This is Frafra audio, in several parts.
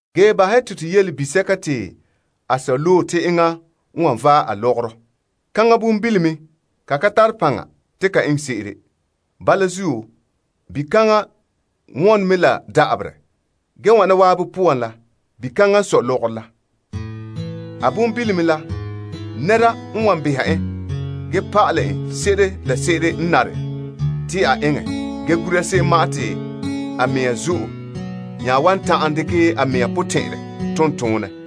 Ge bahɛ te to yele bisɛka te a sɔ loe te enŋa n wan vaɛ a lɔgɔrɔ, kaŋa bonbilome ka tare paŋa te ka eŋɛ se'ere. Bala zuo, bikaŋa wɔne mɛ la da'aberɛ. Ge wana zan'an poan la, bikaŋa n sɔe lɔgɔrɔ la. A bonbilome la, nɛreba n wan behɛ en ge pa'ale n se'ere la se'ere n nare te a eŋɛ ge gura se'em ma'an te a mɛŋa zo'e nya wan dekɛ a mɛŋa potɛn'ɛrɛ tom toonɛ.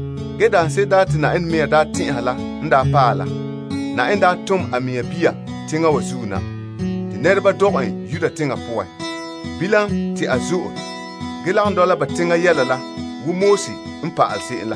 Ge daanse'ere te Yenɛ mɛŋa n daa loe la n paɛ la, a tom a mɛŋa Bia teŋa wa zuo na, te pɔka dɔgɛ en te a lagom dɔla pa'alegɔ se'em la.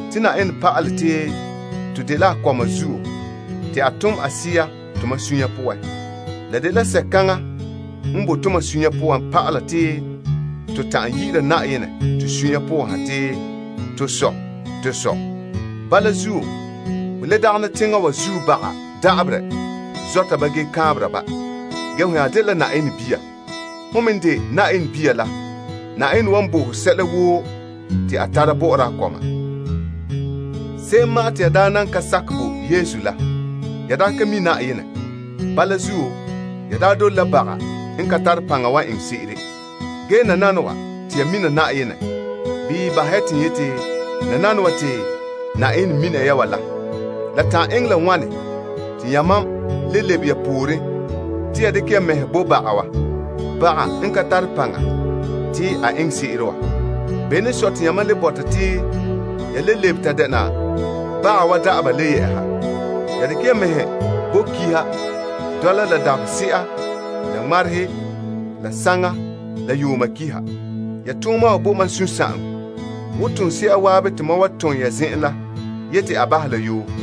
Yenɛ n bote a pa'ale te to dela a kɔma la zuo te a tom a Bia Sea tomam sunya poan. La dela Sea kaŋa n bahɛ te to ta'an yi'ira Yenɛ te to sunya poan ha te, To Sɔ, to Sɔ. Bala zuo, ho le dagana teŋa wa zuo panhe da'aberɛ, ge ho nya dela Yenɛ bia. Hon me n de Yenɛ bia la, Yenɛ wan bo ho sɛla woo te a tara bɔ'ɔra a kɔma. Se'em ma'an te ya daa nan ka nam Yesu la, ya daa ka mi' Yenɛ. Bala zuo, ya daa dole baga n ka tare paŋa wa eŋɛ se'ere. Ge nananawa te ya mina Yenɛ. Bii n yeti, nananawa te Yenɛ mina ya wa. La eŋɛ la wane te yamam le lebe ya pooren te ya dekɛ ya mɛhe bo baga wa, baga n ka tare paŋa te a eŋɛ se'ere wa? Bene n sɔe te yamam le bɔta te ya le lebe ta dɛna baga wa da'aba wa le yɛ'ɛha? Ya dekɛ ya mɛhe bo kiha, dɔla la dabahese'a la ŋmarehe la saŋa la yuuma kiha. Ya tooma wa bo mam sunsagaŋɔ, la ane wo toonse'a zan'an te mam wa tom ya zen'en la yeti a bahɛ la yoo.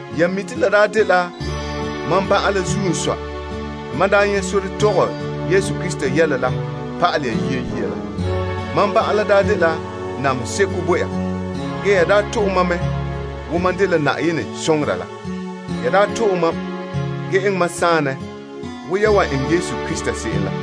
Ya mi' te la daa dela mam ban'an la zuo n sɔe te mam daa nyɛ' sore tɔgɛ Yesu Krista yɛla la pa'alɛ ya yia la. Mam ban'an la daa dela namehe seko bo ya, ge daa to'e mam mɛ wo mam dela Yenɛ soŋora la. Ya daa to'e mam ge eŋɛ mam saanɛ wo ya wan eŋɛ Krista Yesu se'em la.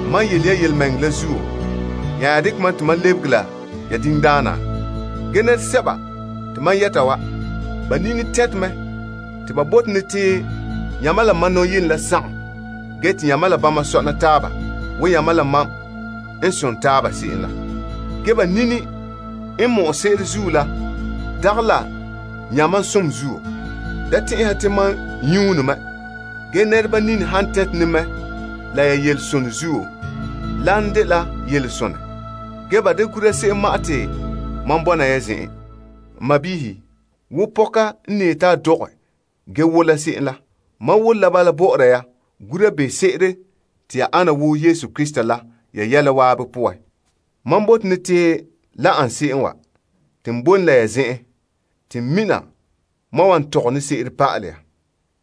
Mam n yele ya yelemɛŋɛrɛ la zuo, ya nya dekɛ mam te n lebege la ya diŋdaana? Ge nɛresɛba te mam yɛta wa, ba nini tɛnte mɛ te ba bote ne te yamam la mam nɔyenɛ la sagom ge te yamam la bama sɔna taaba wo yamam la mam n son taaba se'em la. Ge ba nini n mɔ'ɛ se'ere zuo la dagɛ la yamam som zuo. Da tɛn'ɛhɛ ya te mam nyuune mɛ, ge nɛreba nini han tɛnte ne mɛ la ya yelesonɛ zuo, lan dela yelesonɛ. Ge ba da gura se'em ma'an te mam bɔna ya zen'en. N kɔma wa, wo pɔka n ne yeti a dɔgɛ ge wola se'em la, mam wole bala bɔ'ɔra ya gura te ya ta ana wo Krista la ya yɛla woo poan. Mam bote ne te la ana se'em n wana, n bote ne te boe ne la ya zen'en te n mina mam n wan tɔgɛ se'ere pa'ale ya.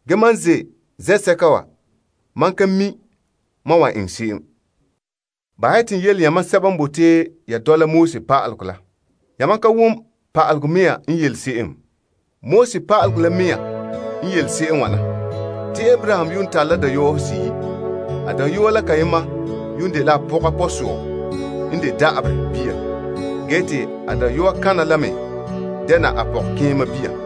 Ge mam n ze' zen'sɛka wa, mam ka mi' mam n wa eŋɛ se'em. Bahɛ ya te n yele yamam sɛba n bote ya dɔla pa'alegɔ la. Yamam ka wom pa'alegɔ mea n yele se'em? Pa'alegɔ la mea n yele se'em n wana. Te Abraham yuun tare la dayɔɔhe seyi'. A dayɔa la kayema yuun dela a pɔga pɔsɔɔ n de da'aberɛ bia, ge te a dayɔa kana la me dɛna a pɔgɔkeema bia.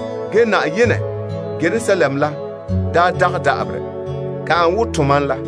Ge saazuo Yerusalem la boe la fai, kaŋa n de tomam ma'.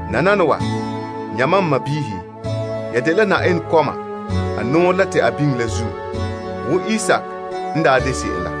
Nananawa, yamam, n sɔɔnrɔ, ya dela Yenɛ kɔma a nɔɔrɛ la te a biŋe la zuo, wo Isaak n daa de se'em la.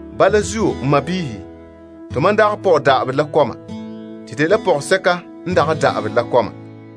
Bala zuo, n sɔɔnrɔ, tomam dagɛ pɔge da'aberɛ la kɔma. To dela pɔgɔsɛka n fai wa kɔma.